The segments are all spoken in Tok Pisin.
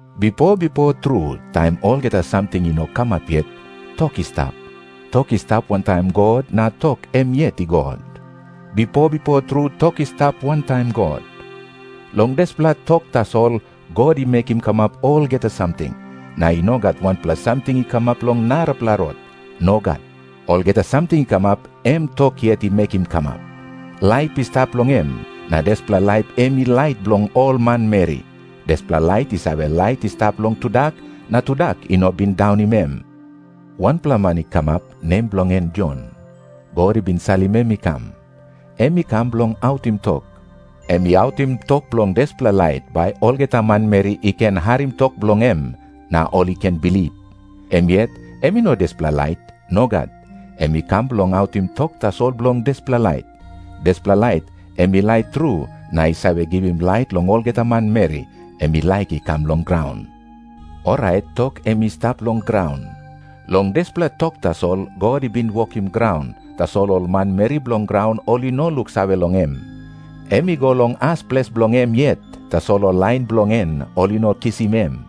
Bipo bipo tru, taim olgeta samting i no kamap yet, Tok i stap. Tok i stap wantaim God na Tok em yet i God. Bipo bipo tru Tok i stap wantaim God. Long dispela Tok tasol God i mekim kamap olgeta samting. Na i no gat wanpela samting i kamap long narapela rot. Nogat. Olgeta samting i kamap, em Tok yet i mekim kamap. Laip i stap long em, na dispela laip em i lait bilong ol manmeri. Dispela lait i save lait i stap long tudak, na tudak i no bin daunim em. Wanpela man i kamap, nem bilong en Jon. God i bin salim em i kam. Em i kam bilong autim tok. Em i autim tok bilong dispela lait, bai olgeta manmeri i ken harim tok bilong em, na ol i ken bilip. Em yet em i no dispela lait. Nogat. Em i kam bilong autim tok tasol bilong dispela lait. Dispela lait em i lait tru na i save givim lait long olgeta manmeri, em i laik i kam long graun. Orait Tok em i stap long graun. Long dispela Tok tasol God i bin wokim graun, tasol ol manmeri bilong graun ol i no luksave long em. Em i go long as ples bilong em yet, tasol ol lain bilong en ol i no kisim em.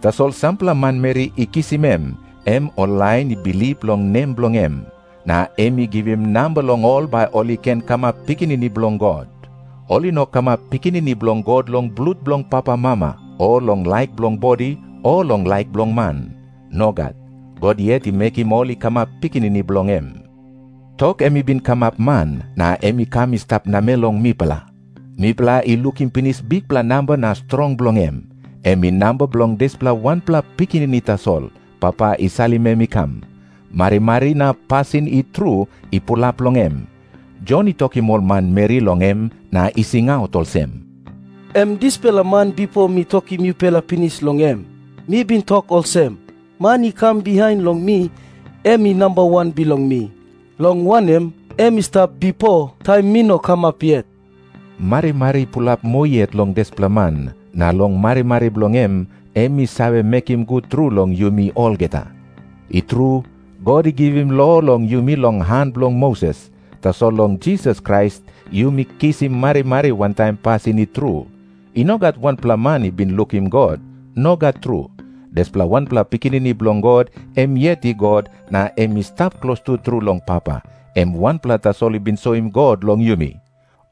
Tasol sampela manmeri i kisim em, em ol lain i bilip long nem bilong em. Na em i givim namba long ol bai ol i ken kamap pikinini bilong God. Ol i no kamap pikinini bilong God long blut bilong papamama, o long laik bilong bodi, o long laik bilong man. Nogat. God yet i mekim ol i kamap pikinini bilong em. Tok em i bin kamap man, na em i kam i stap namel long mipela. Mipela i lukim pinis bikpela namba na strong bilong em. Em i namba bilong dispela wanpela Pikinini tasol, Papa i salim em i kam. Marimari na pasin i tru i pulap long em. Jon i tokim ol manmeri long em na i singaut olsem, "Em dispela man, bipo mi tokim yupela pinis long em. Mi bin tok olsem, 'Man i kam bihain long mi, em i namba wan bilong mi. Long wanem, em i stap bipo, taim mi no kamap yet.'" Marimari i pulap moa yet long dispela man, na long marimari bilong em, em i save mekim gut tru long yumi olgeta. I tru, God i givim lo long yumi long han bilong Moses. Tasol long Jisas Krais yumi kisim marimari wantaim pasin i tru. I no gat wanpela man i bin lukim God. Nogat tru. Dispela wanpela Pikinini Bilong God, em yet i God na em i stap klostu tru long Papa, em wanpela tasol i bin soim God long yumi.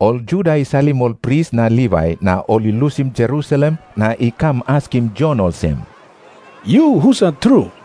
Ol Juda i salim ol pris na Livai na ol i lusim Jerusalem na i kam askim Jon olsem, "Yu husat tru?"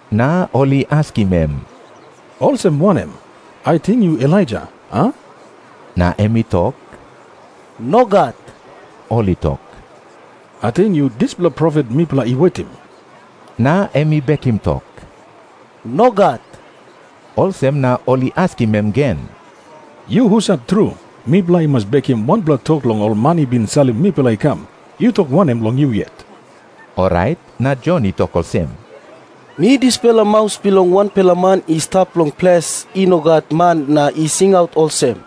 Na ol i askim em, "Olsem wanem? Ating yu Elaija, a?" Na em i tok, "Nogat. … "Ating yu dispela profet mipela i wetim?" Ol i tok, Na em I bekim tok, "Nogat." Olsem na ol i askim em gen, "Yu husat tru? Mipela i mas bekim wanpela tok long ol man i bin salim mipela i kam. Yu tok wanem long yu yet?" Orait na Jon i tok olsem, "Mi dispela 'maus bilong wanpela man i stap long ples i no gat man na i singaut olsem,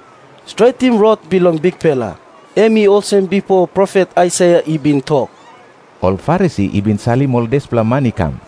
"Stretim rot bilong Bikpela."' Em i olsem bipo profet Aisaia i bin tok." Ol Farisi i bin salim ol dispela man i kam.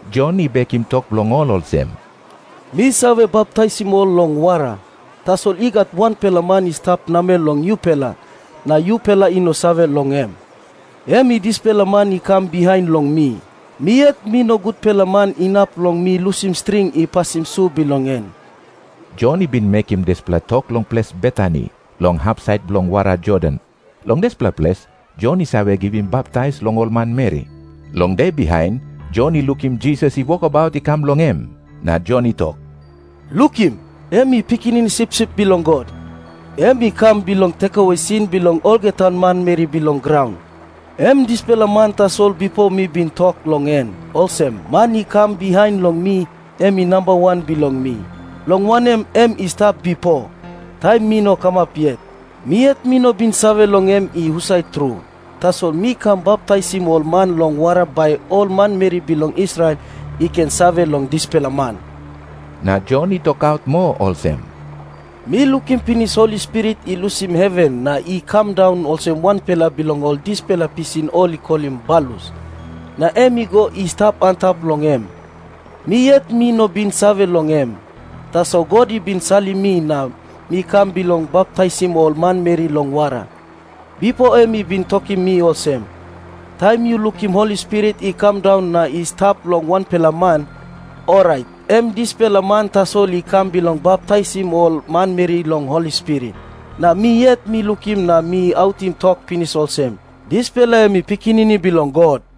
Jon i bekim tok bilong ol olsem, "Mi save baptaisim ol long wara. Tasol i gat wanpela man i stap namel long yupela, na yupela i no save long em. Em i dispela man i kam bihain long mi. Mi yet mi no gutpela man inap long mi lusim string i pasim su bilong en. Jon i bin mekim dispela tok long ples Betani, long hapsait bilong wara Jordan. Long dispela ples Jon i save givim baptais long ol manmeri. Long de bihain, Jon i lukim Jisas i wokabaut i kam long em. Na Jon i tok, "Lukim. Em i Pikinini Sipsip Bilong God. Em i kam bilong tekewe sin bilong olgeta manmeri bilong graun. Em dispela man tasol bipo mi bin tok long en olsem, 'Man i kam bihain long mi, em i namba wan bilong mi. Long wanem, em i stap bipo, taim mi no kamap yet. Mi yet mi no bin save long em i husat tru. Tasol mi kam baptaisim ol man long wara bai ol manmeri bilong Israel i ken save long dispela man." Na Jon i tokaut moa olsem, "Mi lukim pinis Holi Spirit i lusim heven na i kam daun olsem wanpela bilong ol dispela pisin ol i kolim balus, na em i go i stap antap long em. Mi yet mi no bin save long em. Tasol God i bin salim mi na mi kam bilong baptaisim ol manmeri long wara, bipo em i bin tokim mi olsem, 'Taim yu lukim Holi Spirit i kam daun na i stap long wanpela man, orait em dispela man tasol i kam bilong baptaisim ol manmeri long Holi Spirit.' Na mi yet mi lukim na mi autim tok pinis olsem, dispela em i Pikinini Bilong God."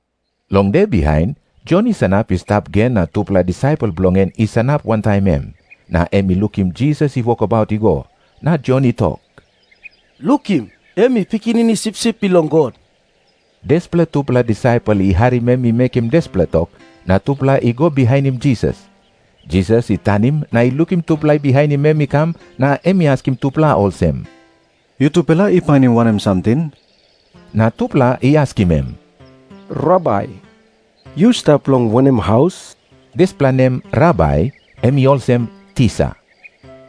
Long de bihain, Jon i sanap i stap gen na tupela disaipel bilong en i sanap wantaim em. Na em i lukim Jisas i wokabaut i go. Na Jon i tok, "Lukim. Em i Pikinini Sipsip Bilong God." Dispela tupela disaipel i harim em i mekim dispela tok, na tupela i go bihainim Jisas. Jisas i tanim na i lukim tupela i bihainim em i kam, na em i askim tupela olsem, "Yutupela i painim wanem samting?" Na tupela i askim em, "Rabai, Dispela nem "Rabai" em i olsem, "Tisa." yu stap long wanem haus?"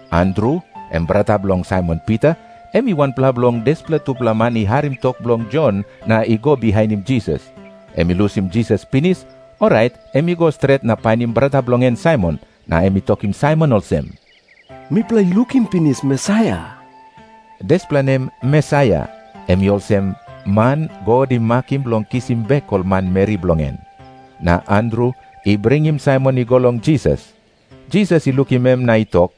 Andru, em brata bilong Saimon Pita, em i wanpela bilong dispela tupela man i harim tok bilong Jon na i go bihainim Jisas. Em i lusim Jisas pinis, orait em i go stret na painim brata bilong en Saimon, na em i tokim Saimon olsem, "Mipela i lukim pinis Mesaia." Dispela nem "Mesaia" em i olsem," Man God i makim bilong kisim bek ol manmeri bilong en." Na Andru I bringim Saimon i go long Jisas. Jisas i lukim em na i tok,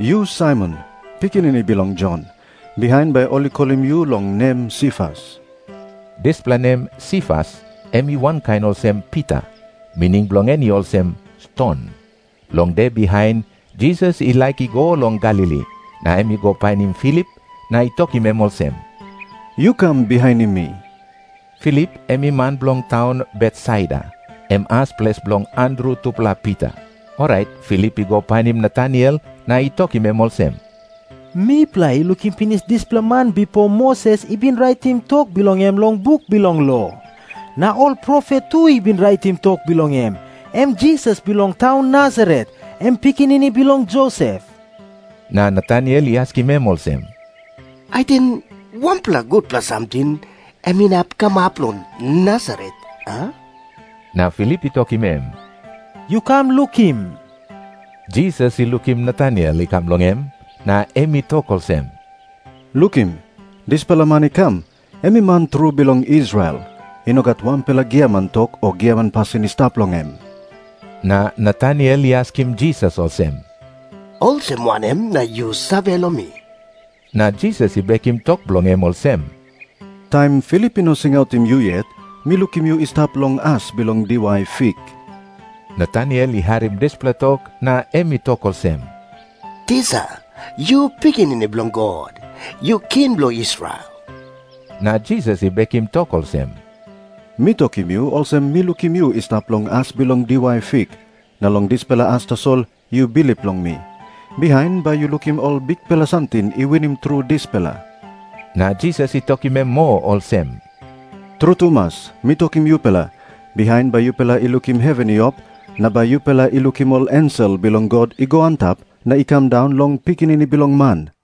"Yu Saimon, pikinini bilong Jon. Bihain bai ol i kolim yu long nem Sifas." Dispela nem "Sifas" em i wankain olsem "Pita." Mining bilong en i olsem, "Ston." Long de bihain, Jisas i laik i go long Galili. Na em i go painim Filip, na i tokim em olsem, "Yu kam bihainim mi." Filip em i man bilong taun Betsaida, em as ples bilong Andru tupela Pita. Orait Filip i go painim Nataniel na i tokim em olsem, "Mipela I lukim pinis dispela man bipo Moses i bin raitim tok bilong em long buk bilong lo, na ol profet tu i bin raitim tok bilong em. Em Jisas bilong taun Nasaret, em pikinini bilong Josep." Na Nataniel i askim em olsem, "Ating wanpela gutpela samting em inap kamap long Nasaret, a?" Na Filip i tokim em, "Yu kam lukim." Jisas i lukim Nataniel I kam long em, na em i tok olsem, "Lukim. Dispela man i kam, em i man tru bilong Israel. I no gat wanpela giaman tok o giaman pasin i stap long em." Na Nataniel i askim Jisas olsem, "Olsem wanem na yu save long mi?" Na Jisas i bekim tok bilong em olsem, "Taim Filip i no singautim yu yet, mi lukim yu i stap long as bilong diwai fik." Nataniel i harim dispela tok na em i tok olsem, "Tisa, yu Pikinini Bilong God. Yu King bilong Israel." Na Jisas i bekim tok olsem, "Mi tokim yu olsem mi lukim yu i stap long as bilong diwai fik, na long dispela as tasol yu bilip long mi. Bihain bai yu lukim ol bikpela samting i winim tru dispela." Na Jisas i tokim em moa olsem, "Tru tumas mi tokim yupela, bihain bai yupela i lukim heven i op, na bai yupela i lukim ol ensel bilong God i go antap na i kam daun long Pikinini Bilong Man."